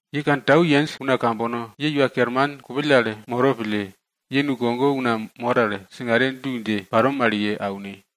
Ye kantau yenj una kambono, ye Iwa Kerman kupill al moro pille, ye boi kogone una mor al singare du dje paro mal ye aune.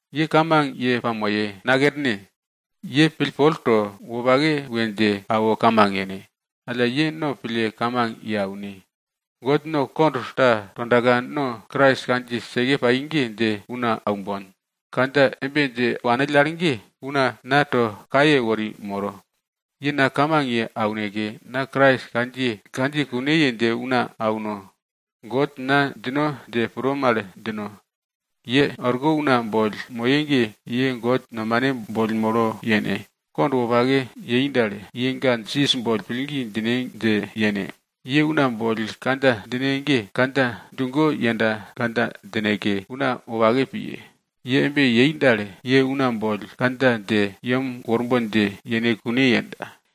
Ye kamang ye pamoye, nakerne. Ye pillpol to, wopake we dje awo kamang yene. Alla ye no pille kamang ye aune. God no kond ta tondaka no Krais kandjiye seke pai ge dje una aumbon. Kandja embe dje wanill al ge, una na to kaye wori moro. Ye na kamang ye auneke, na Krais kandjiye kune ye dje una auno. God na djino dje pro mal djino. Ye orko una boll moye ge, ye God nomane boll molo yene. Kond wopake yei dal, ye ga Jisas boll pillgi djine dje yene. Ye una boll kandja djine ge, kandja djugo yenda kandja djineke, una wopake piye. Ye embe yei dal, ye una boll kandja dje yem worbon dje yene kune yenda.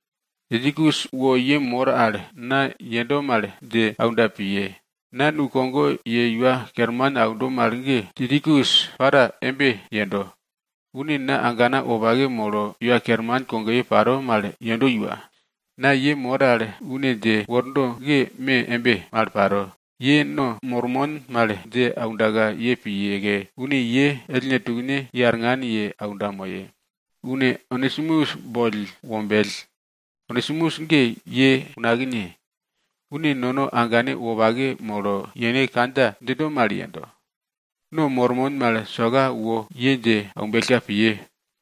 Tikikus wo ye mor al na yendo mal dje aunda piye. Na nukogo ye Iwa Kerman aundo mal ge, Tikikus para embe yendo. Une na agana wopake molo Iwa Kerman kogoye paro mal yendo iwa. Na ye mor al une dje wordo ge me embe mal paro, ye no mormon mal dje aundaka ye piyeke, une ye ellne tukne ye arngan ye aunda moye. Une Onesimus boll wombell. Onesimus ge ye unakne. Une nono agane wopake molo yene kandja djindo mal yendo. No mormon mal soka wo ye dje aumbellka piye.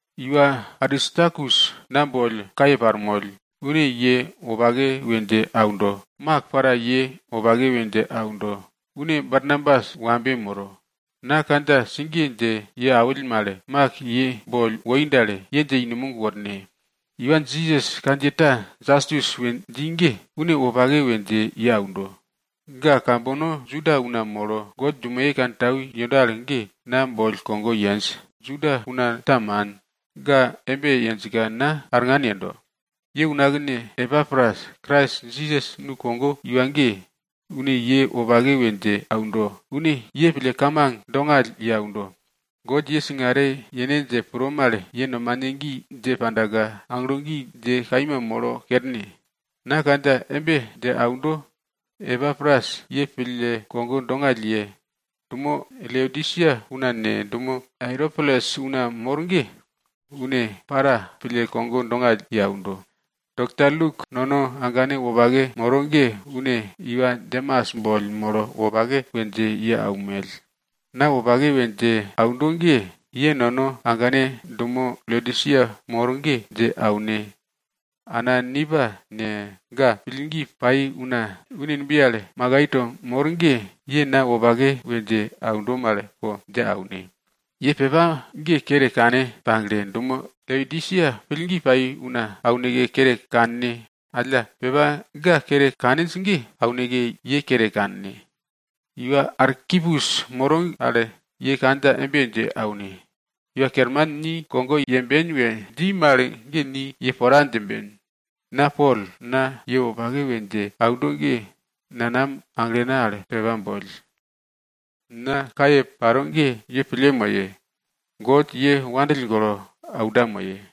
Iwa Aristarkus na boll kaye parmoll, une ye wopake we dje aundo. Mak para ye wopake we dje aundo, une Barnabas wambe moro. Na kandja sigiye dje ye awill mal, Mak ye boll woi dal, ye dje i numog worne. Iwa Jisas kandjiye ta Jastus we dji ge, une wopake we dje ye aundo. Ga kambono Juda una molo God dumoye wopake kantau yendo al ge na boll kogo yenj. Juda una ta man. Ga embe yenjka na arngan yendo. Ye unakne Epapras Krais Jisas nukogo iwa ge, une ye wopake we dje aundo. Une ye pille kamang dongall ye aundo. God ye singare yene dje pro mal ye nomane gi dje pandaka aglo gi dje kaima molo kerne. Na kandja embe dje aundo, Epapras ye pille kogo dongall ye aundo. Dumo Laodisia una ne, dumo Airopolis una mor ge, une para pille kogo dongall ye aundo. Dokta Luk, nono agane wopake moro ge, une iwa Demas boll molo wopake we dje ye aunmell. Na wopake we dje aundo ge, ye nono agane ambane dumo Laodisia mor ge dje aune. Ana Nimpa ne, ga pillgi pai una une numbiye al makai to mor ge, ye na wopake we dje aundo mal po dje aune. Ye pepa ge kere kane pagle, dumo Laodisia pillgi pai una auneke kere kanne. Alla pepa ga kere kaninj ge, auneke ye kere kanne. Iwa Arkipus moro al ye kandja embe dje aune, Iwa Kerman ni kogo yemben we dji mal ge ni ye pora djimben. Na Pol, na ye wopake we dje aundo ge, nanam aglena al pepa boll. Na kaye paro ge ye pille moye. God ye wopake pille aunda moye.